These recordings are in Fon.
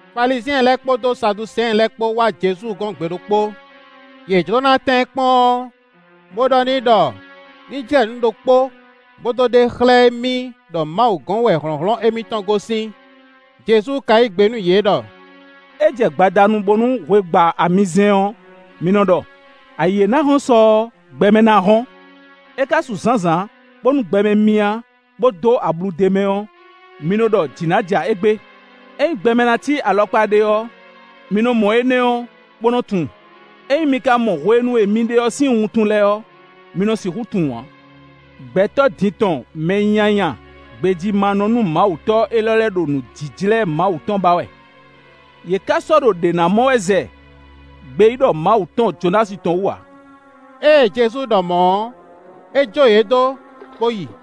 Falizyɛn lɛ́ɛ kpódó Saduseɛn lɛ́ɛ kpó wá Jezu gɔ́n gbe ɖokpó. Yě jló ná tɛ́n ɛ kpɔ́n ɔ́, bó ɖɔ n'i ɖɔ ní jlɛ́ nǔ ɖokpó bó dó ɖe xlɛ́ émí ɖɔ Mawu gɔ́n wɛ hlɔ̌nhlɔ́n émítɔn gosín. Jezu ka yí gbe nú yě ɖɔ: “É jɛ gbadanu bónú hwe gba amizɛ́n ɔ́, mi nɔ ɖɔ: ‘Ayǐ e ná hɔ́n sɔ ɔ́, gbɛmɛ ná hɔ́n.’ É ka su zǎnzǎn bónú gbɛmɛ myá, bó dó ablu d'é mɛ ɔ́, mi nɔ ɖɔ jǐ ná ja égbé. Ényí gbɛmɛ ná cí alɔkpa ɖé ɔ́, mi nɔ mɔ énɛ́ ɔ́, bó nɔ́ tunwun. Ényí mi ka mɔ hwenu e mi ɖe ɔ́ sín wuntun lɛ́ɛ ɔ́, mi nɔ sixú tunwun ǎ. Gbɛtɔ́ din tɔn mɛ nyanya gbejímánɔ-númawutɔ́ élɔ́ lɛ́ɛ ɖo nǔjíjlɛ́ Mawu tɔn ba wɛ, yě ká sɔ́ ɖo ɖě ná mɔ wɛ, zɛ gbeyíɖɔ Mawu tɔn Jonási tɔn wú ǎ.” Ée Jezu ɖɔ mɔ̌ ɔ́, é jó yě dó, bó yi.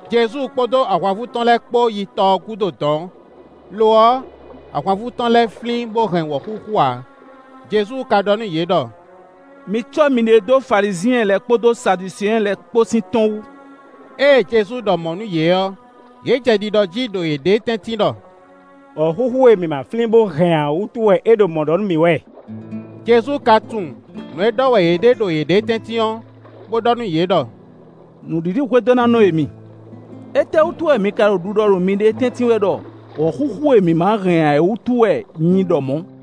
Jezu kpódó ahwanvú tɔn lɛ́ɛ kpó yi tɔ ɔ́ gúdo dɔ̌n; lo ɔ́, ahwanvú tɔn lɛ́ɛ flín bó hɛn wɔ̌xúxú ǎ. Jezu ka ɖɔ nú yě ɖɔ: “Mi cɔ́ miɖée dó Falizyɛn lɛ́ɛ kpódó Saduseɛn lɛ́ɛ kpó sín tɔ́n wú.” Ée Jezu ɖɔ mɔ̌ nú yě ɔ́, yě jɛ ɖiɖɔ jí ɖo yěɖée tɛ́ntin ɖɔ: “Wɔ̌xúxú e mǐ ma flín bó hɛn ǎ wútu wɛ é ɖo mɔ̌ ɖɔ nú mǐ wɛ.” Jezu ka tunwun nǔ e ɖɔ wɛ yě ɖe ɖo yěɖée tɛ́ntin ɔ́, bó ɖɔ nú yě ɖɔ: “Nǔɖiɖihwedónánɔ e mi, étɛ́wútu wɛ mi ka ɖo ɖiɖɔ ɖo miɖée tɛ́ntin wɛ ɖɔ wɔ̌xúxú e mi ma hɛn ǎ é wútu wɛ nyi ɖɔ mɔ̌?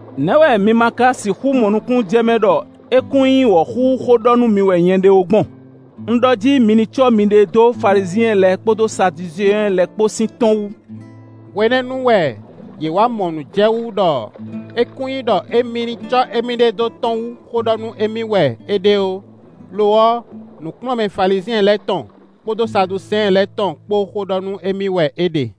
Nɛ̌ wɛ mi ma ka sixú mɔ nukúnnú jɛ mɛ ɖɔ é kún nyí wɔ̌xúxú xó ɖɔ nú mi wɛ nyɛ ɖe ó gbɔn? Un ɖɔ jí mi ní cɔ́ miɖée dó Falizyɛn lɛ́ɛ kpódó Saduseɛn lɛ́ɛ kpó sín tɔ́n wú.” Hwenɛ́nu wɛ yě wá mɔ nǔ jɛ wú ɖɔ é kún nyí ɖɔ émí ní cɔ́ émíɖée dó tɔ́n wú xó ɖɔ nú émí wɛ é ɖe ó; lo ɔ́, nǔkplɔ́nmɛ Falizyɛn lɛ́ɛ tɔn kpódó Saduseɛn lɛ́ɛ tɔn kpó xó ɖɔ nú émí wɛ é ɖe.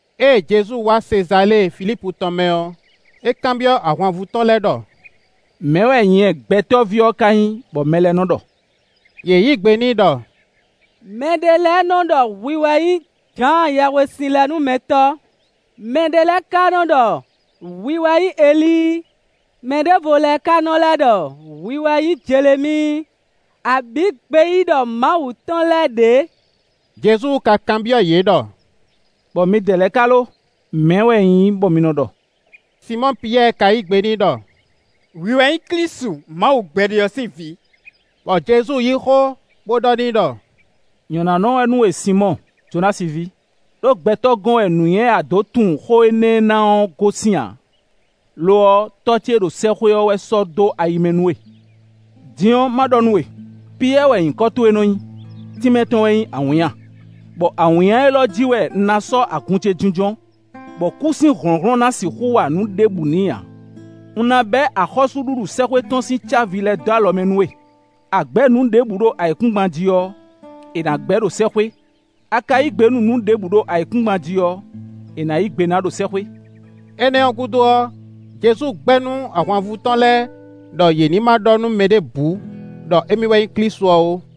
Ée Jezu wá Sezalée Filípu tɔn mɛ ɔ́, é kanbyɔ́ ahwanvú tɔn lɛ́ɛ ɖɔ: “Mɛ̌ wɛ nyɛ Gbɛtɔ́ví ɔ́ ka nyí, bɔ mɛ lɛ́ɛ nɔ́ ɖɔ?” Yě yí gbe n'i ɖɔ: “Mɛ ɖé lɛ́ɛ nɔ́ ɖɔ hwi wɛ nyí Jǎan Yɛhwesinlɛnúmɛtɔ́; mɛɖé lɛ́ɛ ka nɔ́ ɖɔ hwi wɛ nyí Elíi; mɛ ɖěvo lɛ́ɛ ka nɔ́ lɛ́ ɖɔ hwi wɛ nyí Jelemíi, abǐ gbeyíɖɔ Mawu tɔn lɛ́ɛ ɖě.” Jezu ka kanbyɔ́ yě ɖɔ: “Bɔ midɛɛ lɛ́ɛ ka lo, mɛ̌ wɛ un nyí bɔ mi nɔ ɖɔ?” Sinmɔ́ɔ Piyɛ́ɛ ka yí gbe n'i ɖɔ: “Hwi wɛ nyí Klísu Mawu gbɛɖe ɔ́ sín Vǐ.” Bɔ Jezu yí xó bó ɖɔ n'i ɖɔ: “Nyɔ̌nánɔ wɛ nú we Sinmɔ́ɔ, Jonási ví, ɖó gbɛtɔ́ gɔ́n wɛ nǔnywɛ́ e a dǒ tunwun xó énɛ́ ná ɔ́ gosín ǎ; lo ɔ́, Tɔ́ ce e ɖo sɛ́xwé ɔ́ wɛ sɔ́ dó ayi mɛ nú we. Din ɔ́, má ɖɔ nú we: Piyɛ́ɛ wɛ nyǐkɔ towe nɔ́ nyí, tínmɛ tɔn wɛ nyí awǐnnya, bɔ awǐnnya élɔ́ ɔ́ jí wɛ un ná sɔ́ agun ce jínjɔ́n, bɔ kú sín hlɔ̌nhlɔ́n ná sixú wa nǔ ɖěbǔ n'i ǎ. Un ná bɛ́ axɔ́súɖuɖu sɛ́xwé tɔn sín cávi lɛ́ɛ dó alɔ mɛ nú we; a gbɛ̌ nǔ ɖěbǔ ɖo ayǐkúngban jí ɔ́, è nǎ gbɛ́ ɖo sɛ́xwé; a ka yí gbe nú nǔ ɖěbǔ ɖo ayǐkúngban jí ɔ́, è nǎ yí gbe ná ɖo sɛ́xwé.” Énɛ́ ɔ́ gúdo ɔ́, Jezu gbɛ́ nú ahwanvú tɔn lɛ́ɛ ɖɔ yě ní ma ɖɔ nú mɛ ɖěbǔ ɖɔ émí wɛ nyí Klísu ɔ́ ó.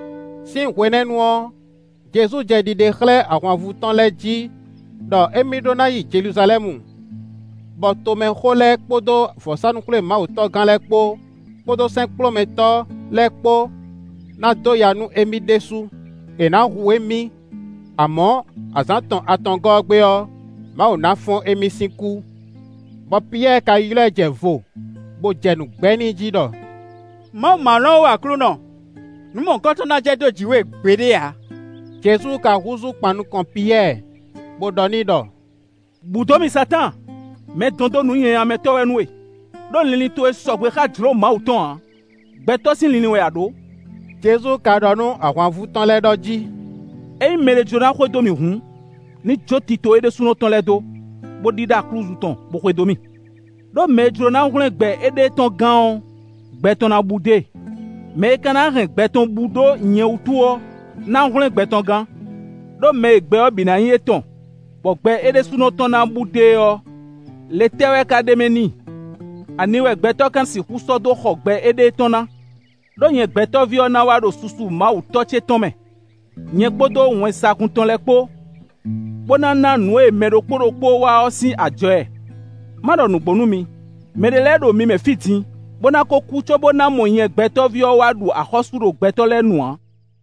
Sín hwenɛ́nu ɔ́, Jezu jɛ ɖiɖe xlɛ́ ahwanvú tɔn lɛ́ɛ jí ɖɔ émí ɖó ná yi Jeluzalɛ́mu, bɔ tomɛxó lɛ́ɛ kpódó vɔ̌sánú-xwlémawutɔ́gán lɛ́ɛ kpó, kpódó sɛ́nkplɔ́nmɛtɔ́ lɛ́ɛ kpó ná dó ya nú émí ɖésú; è nǎ hu émí, amɔ̌, azǎn tɔn atɔngɔ́ ɔ́ gbe ɔ́, Mawu ná fɔ́n émí sín kú. Bɔ Piyɛ́ɛ ka ylɔ́ ɛ jɛ vo, bó jɛ nǔ gbɛ́ n'i jí ɖɔ: “Mawu ma lɔn ó Aklúnɔ; nǔ mɔ̌hunkɔtɔn ná jɛ dó jǐ we gbeɖé ǎ.” Jezu ka húzú kpan nukɔn Piyɛ́ɛ, bó ɖɔ n'i ɖɔ: “Bǔ dó mì Satáan! Mɛdɔndó-nǔnyanyamɛtɔ́ wɛ nú we; ɖó linlin towe sɔgbe xá jlǒ Mawu tɔn ǎ; gbɛtɔ́ sín linlin wɛ a ɖǒ.” Jezu ka ɖɔ nú ahwanvú tɔn lɛ́ɛ ɖɔ jí: “Ényí mɛɖé jló ná xwedó mì hǔn, ní jó tito é ɖésúnɔ tɔn lɛ́ɛ dó, bó ɖíɖá aklúzu tɔn, bó xwedó mì. Ɖó mɛ e jló ná hwlɛ́n gbɛ éɖée tɔn gán ɔ́, gbɛ tɔn ná bú dó e; mɛ e ka ná hɛn gbɛ tɔn bú ɖó nyɛ wútu ɔ́, ná hwlɛ́n gbɛ tɔn gán. Ɖó mɛ e gbɛ ɔ́ bǐ ná nyí étɔn, bɔ gbɛ é ɖésúnɔ tɔn ná bú dó e ɔ́, le tɛ́ wɛ ka ɖ'é mɛ n'i? Ani wɛ gbɛtɔ́ ka sixú sɔ́ dó xɔ gbɛ éɖée tɔn ná? Ɖó nyɛ Gbɛtɔ́ví ɔ́ ná wá ɖo susu Mawu Tɔ́ ce tɔn mɛ, nyɛ kpódó wɛnsagun tɔn lɛ́ɛ kpó, bó ná ná nǔ e mɛ ɖokpó ɖokpó wa ɔ́ sín ajɔ ɛ. Ma ɖɔ nǔgbó nú mi: mɛɖé lɛ́ɛ ɖo mi mɛ fí din, bó ná ko kú cóbó ná mɔ nyɛ Gbɛtɔ́ví ɔ́ wá ɖu axɔ́sú ɖo gbɛtɔ́ lɛ́ɛ nu ǎ.”